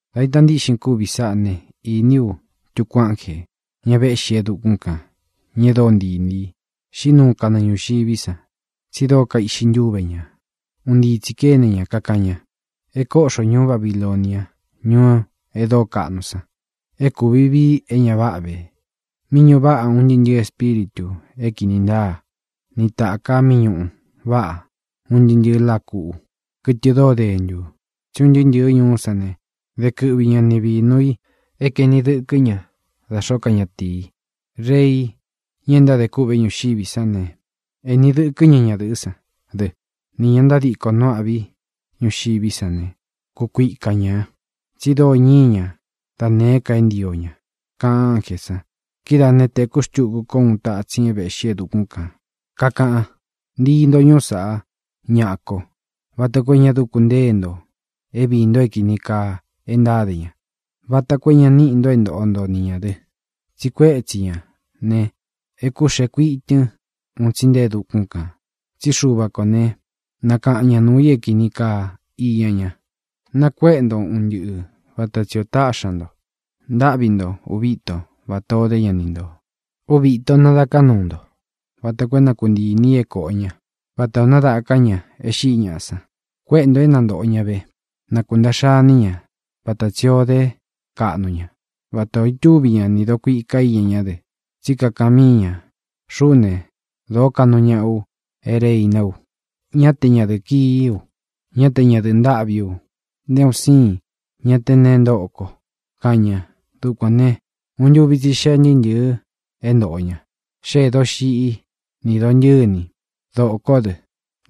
Dā ita ntíꞌxin kúvi sáꞌā né, īní u tuku ánjē, ña véꞌxi e dukún kān, ña e dóo ntii inī i. Xīꞌí nuu kanɨɨ ñūxiví san, tsi dóo kaiꞌxi ntúve ñā. Un ntii tsī kéne ña, kakaꞌan ña: —¡E kóꞌxo ñūú Babilonia, ñuu e dóo kaꞌnu san! É kūvi viꞌi é ña váꞌa vē, mí ñuꞌu váꞌa un ntɨɨ́ ntɨ̄ɨ́ espíritū é kīni ntáa, ni tāka mí ñuꞌu váꞌa un ntɨɨ́ ntɨ̄ɨ láa kuꞌu, kɨtɨ dóo dentū. Tsí un ntɨɨ́ ntɨ̄ɨ́ ñuú san ne, de kɨꞌvi ña ni vīnu i é kaēni dɨkɨ́ ña da xōó ka ñatīi. Rei, ña e ntádē kûꞌvé ñuxiví san ne, ēni dɨkɨ́ ña ñadɨ̄ꞌɨ́ san dɨ, nī ña ntádiko nu âꞌví ñuxiví san ne, kukuika ñā, tsi dóo ñíi ña da nēé ka e ntío ña —kaꞌan ánjē san. Kidáā né, tēkú xtuku kó uun tatsin é vēꞌxí e dukún kān, kakaꞌan: —Ntii nto ñuú saꞌá, ñaꞌa ko, vata koo é ña dúku ntée nto é viī nto é kīni kaa e ntáde ña, vata koo é ña níꞌi nto é ntoꞌo nto ni ñā dɨ. Tsi kuétsi ñā ne, é kūxee kuitɨn un tsi nté e dukún kān. Tsí Xuva kō né, nakaꞌan ña nuū i é kīni kaa iña ña. Nakuéꞌe nto un ntɨꞌɨ vata tsi ō táꞌxi ña nto. Ntáꞌvi nto ūvi íto vatā o dé ña ni ntō. Úvi īto nadaká nuu nto vata koo é na kuntii inī i é kōꞌo ña, vata ō nádaká ña e xíꞌi ñaꞌa san. Kuéꞌe ntō é na ntōꞌo ña ve; na kūntaꞌxa iní ña vata tsī o dé kaꞌnu ña, vatā o itúvi ña nī dokuika íña ñá dɨ. Tsí kakaꞌan míi ña: “Xuꞌú ne, dōó kaꞌnu ñaꞌa u é reiná u. Ñá te ñadɨ̄ꞌɨ kií u; ñá te ñadɨ̄ꞌɨ ntâꞌví u; nté un síin ña te neé ntoꞌo ko”, kaꞌan ña. Dukuān ne, uun ntúvi tsi xee ntɨɨ́ ntɨ̄ɨ é ntōꞌo ña. Xéē doxiꞌí, nī dontɨ̂ní, dōkó dɨ,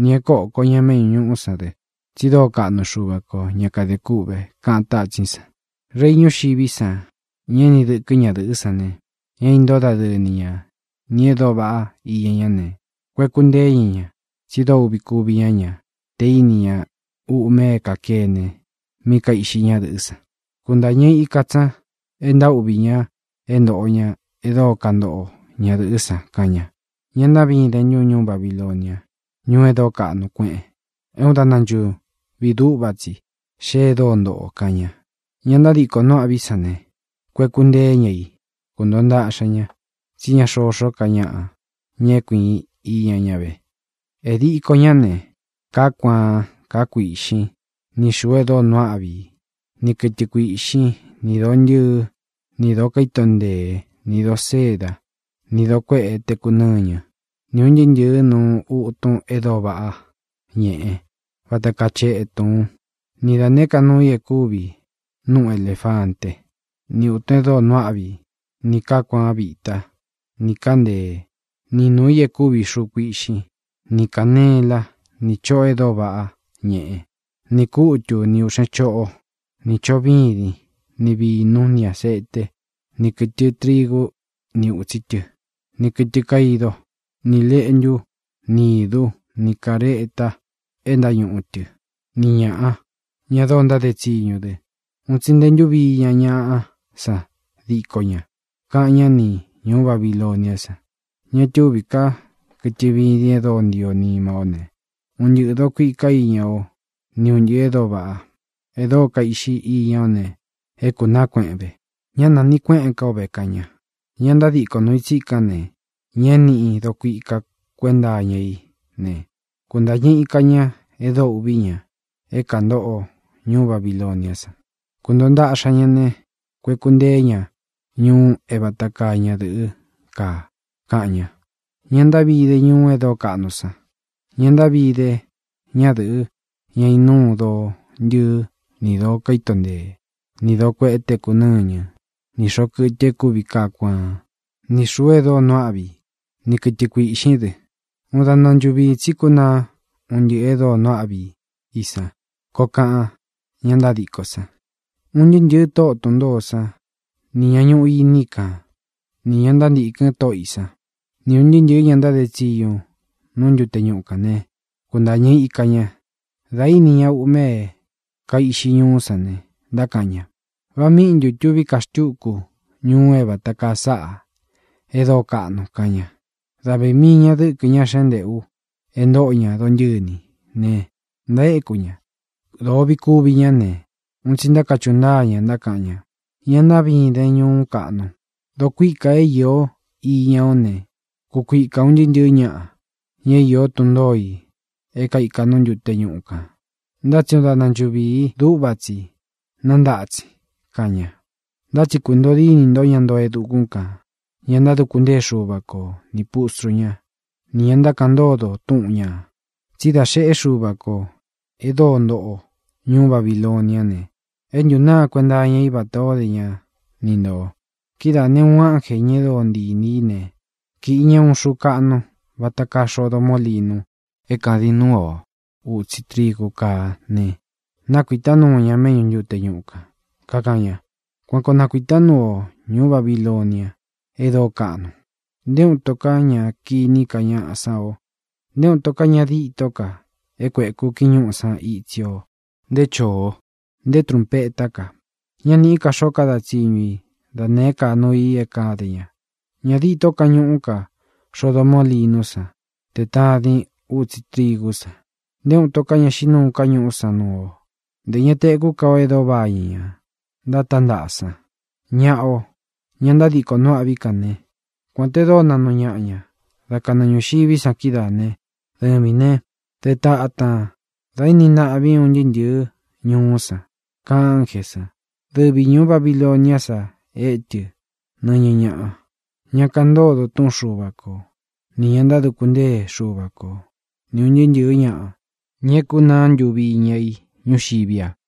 nī é koko ña méꞌñū ñuꞌú san dɨ. Tsi dóo kaꞌnu Xuva kō, ña kade kûꞌve —kaꞌan tátsín san. Rei ñuxiví san, ña éni dɨkɨ́ ñadɨ̄ꞌɨ́ san ne, ña é intóo dadɨɨ ni ña nī e dóo vaꞌá iña ñá ne, kueku nteé ña ña, tsi dóo uꞌvi kuvi ña ña te íni ña uꞌme é kākene mí kaiꞌxi ñádɨ̄ꞌɨ́ san. Kuntāñɨ ika tsi ña, e ntaúꞌvī ña é ntōꞌo ña e dóo kantoꞌo ñadɨ̄ꞌɨ́ san. Káꞌan ñā: —¡Ña ntaꞌví idēn ntun, ñuú Babilonia, ñuu e dóo kaꞌnu kueꞌen! É uun daꞌna nchūvii dúꞌva tsi xee e dóo ntoꞌo o —kaꞌan ña. Ña ntádiko nu âꞌví ñuxiví san ne, kueku nteé ña i. Kuntōo ntaꞌxa ña, tsí ña xoxó ka ñaꞌa, ña é kuīin iña ña ve. E diko ñā né: kāá kuaan, kāá kuīꞌxín, ni xūu e dóo nuu áꞌvi i, ni kɨtɨ kuīꞌxín, ni dōo ntɨɨ́, ni dōo kaíto nteé, ni dōo séda, ni dōo kueꞌé teku nɨ́ñɨ, ni ūn ntɨɨ́ ntɨ̄ɨ́ nuu utun e dóo váꞌa ñeꞌe, vata kaa chetun, ni da nēé ka nuu i e kúvi núꞌu elēfanté, ni ūtun e dóo nuu áꞌvi i, nī kaá kuaan vitá, nī kaá nteé, ni nuū í e kúvi xuu kuiꞌxín, ni kānelá, nī choꞌo e dóo váꞌa ñeꞌe, ni kūtú, ni ūꞌxén choꞌó, nī choꞌo vídin, ni vīnú, ni āseté, ni kɨ̄tɨ trigú ni ūtsi tɨ́, ni kɨ̄tɨ kaidó, ni lēꞌntú, ni īdú, ni kāreta é ntáñuꞌu tɨ, ni ñāꞌa, ña dóo ntáde tsiñu dɨ. Un tsi nte ntúvi iña ñaꞌá san díko ña. Káꞌan ña ni ñūú Babiloniá san: —Ña túvī ká kɨtɨ vidin e dóo ntio nima ó ne, un ntɨꞌɨ̄ dokuika íña o ni un ntɨꞌɨ̄ e dóo vaꞌá, e dóo kaiꞌxi íña ó ne, é kūnaá kueꞌen ve. Ñá nanīꞌi kueꞌén ka ó ve —kaꞌan ña. Ña ntadíko nuu i tsíkān, ña é nīꞌí dokuika kuénta iña í ne, kuntañɨ ika ña e dóo uꞌvī ña é kāntoꞌo ñuú Babiloniá san. Kuntōo ntaꞌxa ñá ne, kueku nteé ña ñuu é vata kaa ña dɨ̄ꞌɨ́ kaa, káꞌan ñā: —¡Ña ntaꞌví ide ñuú e dóo kaꞌnu san! ¡Ña ntaꞌví ide ñadɨ̄ꞌɨ, ña inúu doo ntɨɨ́ ni dōo kaíto ntee, ni dōo kueꞌé teku nɨ́ñɨ, ni xōꞌo kɨtɨ e kúvi kaá kuaán, ni xūu e dóo nuu áꞌvi i, ni kɨtɨ kuīꞌxín dɨ! ¡Uun daꞌna nchuviī tsí kúnaa un ntɨꞌɨ̄ e dóo nuu áꞌvi i san! —koo kaꞌan ña ntádiko san. Un ntɨɨ́ ntɨ̄ɨ tóꞌo tun ntōó san nī ña ñuꞌu iní i kan, nī ña ntántīkɨn tóꞌo ī sán, ni ūn ntɨɨ́ ntɨ̄ɨ́ ña ntáde tsiñu nú ntute ñuꞌu kān ne, kúntāñɨ ika ña. Dā íni ña uꞌme é kaiꞌxi ñuú san ne, ntákaꞌan ña: —¿Va míꞌi ntū tuví ka xtuku ñuu é vata kaa sáꞌā e dóo kaꞌnu? —kaꞌan ña. Dáꞌvi mii ña dɨ̄kɨ ñá xentēꞌu é ntoo ña dontɨ̂ní ne, ntaéku ña. Dōo uꞌvi kúvi ñá ne, un tsi ntákachuꞌu ntáa ña, ntákaꞌan ña: —¡Ña ntaꞌvín idēn, ñuú kaꞌnu! Dokuíka é īo iña ó ne, kukuika ūn ntɨɨ́ ntɨ̄ɨ́ ñaꞌa, ñá īó tun ntōo i é kaika nú ntute ñuꞌu kān. Ntá tsi uun daꞌna nchuviī dúꞌva tsi nántatsin —kaꞌan ña. Ntá tsi kuntōo dínī ntó, ña ntoo e dukún kān, ña ntáduku ntée Xuva ko, nī pustru ñá, nī ña ntákaꞌan ntódo túꞌun ñā, tsí dā xeꞌé Xuva kō e dóo ntoꞌo ñuú Babiloniá ne, é ntūnáa kuenta iña i vata o dé ña ni ntō. Kidáā ne, uun ánjē, ña e dóo ntii inī í ne, kīꞌi ña uun xuu kaꞌnu, vata kaa xodo mólinu é kādin núu o ūtsi trigu káa ne, nakuītá nuu ña méꞌñu ntute ñuꞌu kān, kakaꞌan ña: —Kuan koo nakuītá nuu ú o, ñuú Babilonia e dóo kaꞌnun. Nté uun ito ká ña kiní ka ñaꞌa sán o. Nté uun ito ña dîtó ka é kuēku kiñúꞌu san itsí o, nté choō, nté trunpetá ka. Ñá nīꞌí ka xoó kada tsiñu i da nēé ka nuu i é kāde ña. Ñā ditó kañuꞌú ka xodo mólinú san te tadin útsi trigú san. Nté uun ito ká ña xíꞌi nuu ká ñuꞌú san nuu o. Ntē ña tekú ka o e dóo vañɨ ña ntátántaꞌa san. Ñaꞌa o, ña ntádiko nu âꞌví kān ne, kuān te dóo naꞌnu ñaꞌa ña dá kanɨɨ ñūxiví san kídaā né, dɨvīn ne, dé tatān da éni ntaꞌvín un ntɨɨ́ ntɨ̄ɨ́ ñuú san —kaꞌan ánjē san. Dɨvi ñūú Babiloniá sa étɨ nɨñɨ ñaꞌa, ña kaꞌan ntódo túꞌun Xuva ko, nī ña ntáduku ntée Xuva ko, ni ūn ntɨɨ́ ntɨ̄ɨ́ ñaꞌa, ña é nakunáa ntuvi iña i ñúxiví a.